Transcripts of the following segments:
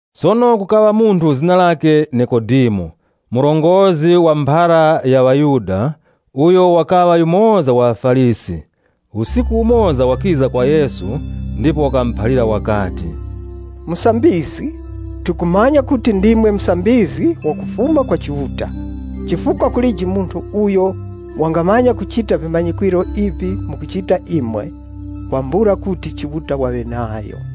Sono kukaŵa munthu zina lakhe Nikodemo, murongozgi wa mu mphara ya ŵaYuda uyo wakaŵa yumoza wa ŵaFarisi. Usiku umoza wakiza kwa Yesu ndipo wakamuphalira wakati, “Musambizgi, tikumanya kuti ndimwe musambizgi wakufuma kwa Chiuta. Chifukwa kulije munthu uyo wangamanya kuchita vimanyikwiro ivi mukuchita imwe, kwambula kuti Chiuta waŵe nayo.”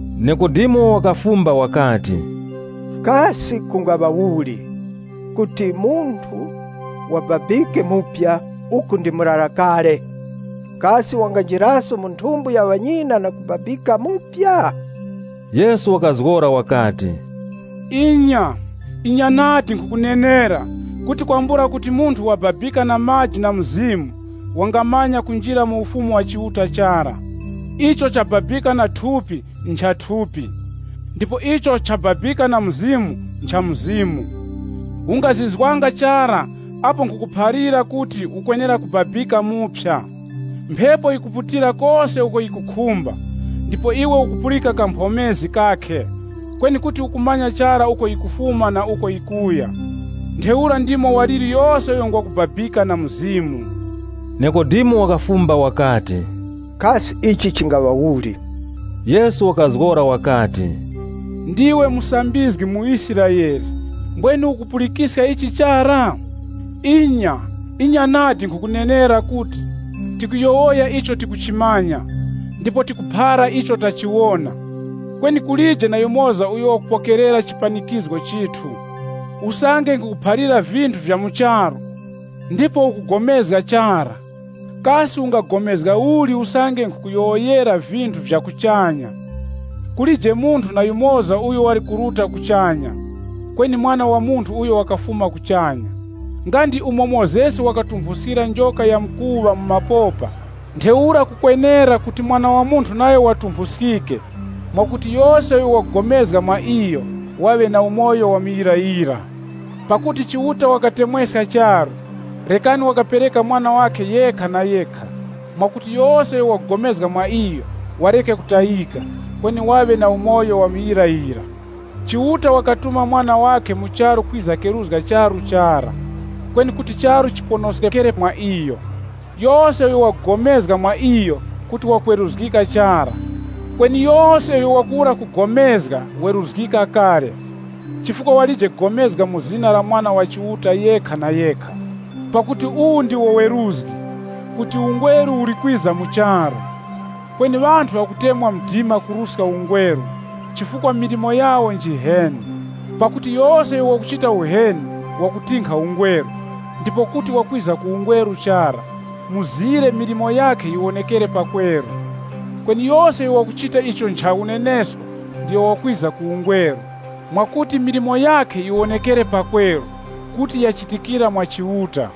Nikodemo wakafumba wakati, “Kasi kungaŵa uli kuti munthu wababikeso uku ndi murara kale? Kasi wanganjiraso mu nthumbo ya ŵanyina na kubabikaso?” Yesu wakazgora wakati, “Inya, inya nadi, nkhukunenera kuti kwambula kuti munthu wababika na maji na Mzimu wangamanya kunjira mu Ufumu wa Chiuta chara. Icho nchakubabika na thupi ncha thupi, ndipo icho nchakubabika na Mzimu ncha Mzimu. Ungazizwanga chara apo ndakuphalira kuti ukwenera kubabika muphya. Mphepo yikuputira kose uko yikukhumba, ndipo iwe ukupulika kamphomezi kakhe, kweni kuti ukumanya chara uko yikufuma na uko yikuya. Ntheura ndimo waliri yose uyo ngwa kubabika na Mzimu.” Nikodemo wakafumba wakati, “Kasi ichi chingaŵa uli?” Yesu wakazgora wakati, “Ndiwe musambizgi mu Israele, mbwenu ukupulikiska ichi chara? Inya, inya nadi nkhukunenera kuti, tikuyowoya icho tikuchimanya, ndipo tikuphara icho tachiwona, kweni kulije na yumoza uyo wakupokerera chipanikizgo chithu. Usange nkhukuphalira vinthu vya mu charu, ndipo ukupulikana chara, kasi ungapulikana uli usange nkhukuyowoyera vinthu vya kuchanya? Kulije munthu na yumoza uyo wali kuruta kuchanya, kweni Mwana wa Munthu uyo wakafuma kuchanya.” Nga ndi umo Mozesi wakatumphuskira njoka ya mkuŵa mu mapopa, ntheura kukwenera kuti Mwana wa Munthu nayo watumphuskike, mwakuti yose uyo wakupulikana mwa iyo waŵe na umoyo wa muyirayira. Pakuti Chiuta wakatemweska charu, rekani wakapereka Mwana wakhe yekha na yekha, mwakuti yose uyo wakupulikana mwa iyo wareke kutayika, kweni waŵe na umoyo wa muyirayira. Chiuta wakatuma Mwana wakhe mu charu kwiza keruzga charu chara, kweni kuti charu chiponoskekere mwa iyo. Yose uyo wakupulikana mwa iyo kuti wakweruzgika chara, kweni yose uyo wakuwura kupulikana, weruzgika kale, chifukwa walije kupulikana mu zina la Mwana wa Chiuta yekha na yekha. Pakuti uwu ndiwo weruzgi, kuti ungweru uli kwiza mu charu, kweni ŵanthu ŵakutemwa mdima kuruska ungweru, chifukwa milimo yawo njiheni. Pakuti yose uyo wakuchita uheni wakutinkha ungweru ndipo kuti wakwiza ku ungweru chara, mzire milimo yakhe yiwonekere pakweru. Kweni yose uyo wakuchita icho ncha unenesko, ndiyo wakwiza ku ungweru, mwakuti milimo yakhe yiwonekere pakweru kuti yachitikira mwa Chiuta.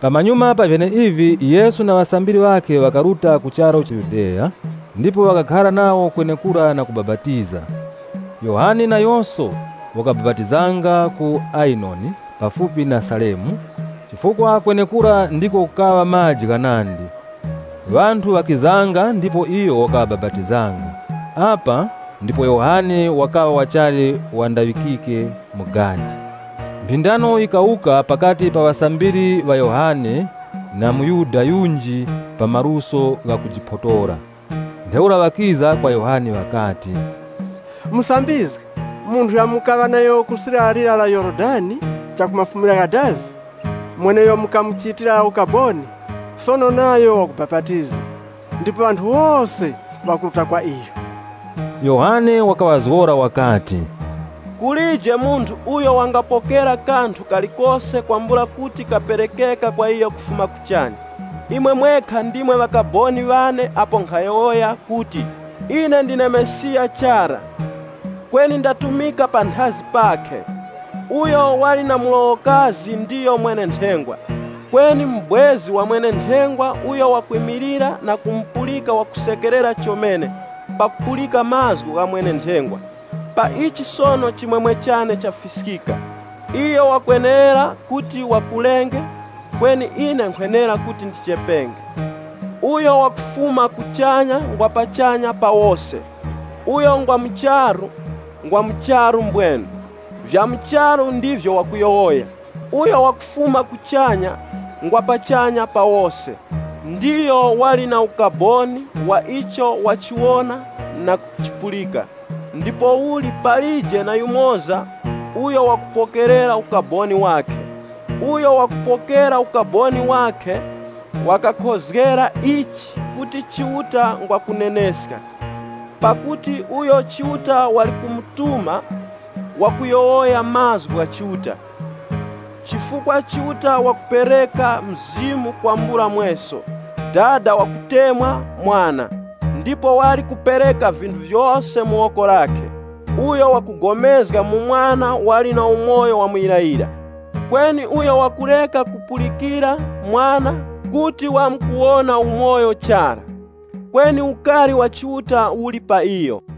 Pamanyuma pa vyeneivi Yesu na ŵasambiri ŵakhe ŵakaruta ku charu Yudeya ndipo wakakhara nawo kwenekura na kubapatiza. Yohane nayoso wakabapatizanga ku Ayenoni pafupi na Salimu, chifukwa kwenekura ndiko kukaŵa maji ghanandi. Ŵanthu ŵakizanga ndipo iyo wakaŵabapatizanga. Apa ndipo Yohane wakaŵa wachali wandaŵikike mu gadi. Mphindano yikawuka pakati pa ŵasambiri ŵa Yohane na mu Yuda yunji pa maluso ghakujiphotora. Ntheura ŵakiza kwa Yohane ŵakati, “Musambizgi, munthu yura mukaŵa nayo ku sirya linyakhe la mronga wa Yorodani, mweneuyo mukamuchitira ukaboni, sono nayo wakubapatiza ndipo ŵanthu wose ŵakuruta kwa iyo.” Yohane wakaŵazgora wakati, “Kulije munthu uyo wangapokera kanthu kalikose kwambula kuti kaperekeke kwa iyo kufuma kuchanya. Imwe mwekha ndimwe ŵakaboni ŵane apo nkhayowoya kuti, ‘Ine ndine Mesiya chara, kweni ndatumika panthazi pakhe.’ Uyo wali na mlowokazi ndiyo mwene-nthengwa. Kweni mubwezi wa mwene-nthengwa uyo wakwimilira na kumupulika wakusekerera chomene pakupulika mazgu gha mwene-nthengwa. Pa ichi sono chimwemwe chane chafiskika. Iyo wakwenera kuti wakulenge kweni ine nkhwenera kuti ndichepenge.” “Uyo wakufuma kuchanya ngwa pachanya pa wose. Uyo ngwa mu charu, ngwa mu charu mbwenu. Vya mu charu ndivyo wakuyowoya. Uyo wakufuma kuchanya, ngwa pachanya pa wose. Ndiyo wali na ukaboni wa icho wachiwona na kuchipulika, ndipouli palije na yumoza uyo wakupokerera ukaboni wakhe. Uyo wakupokera ukaboni wakhe, wakakhozgera ichi kuti Chiuta ngwa kuneneska. Pakuti uyo Chiuta wali kumutuma, wakuyowoya mazgu gha Chiuta, chifukwa Chiuta wakupereka Mzimu kwambula mweso. Dada wakutemwa Mwana, ndipo wali kupereka vinthu vyose mu woko lakhe. Uyo wakupulikana mu Mwana wali na umoyo wa muyirayira. Kweni uyo wakureka kupulikira Mwana kuti wamkuwona umoyo chara, kweni ukari wa Chiuta uli pa iyo.”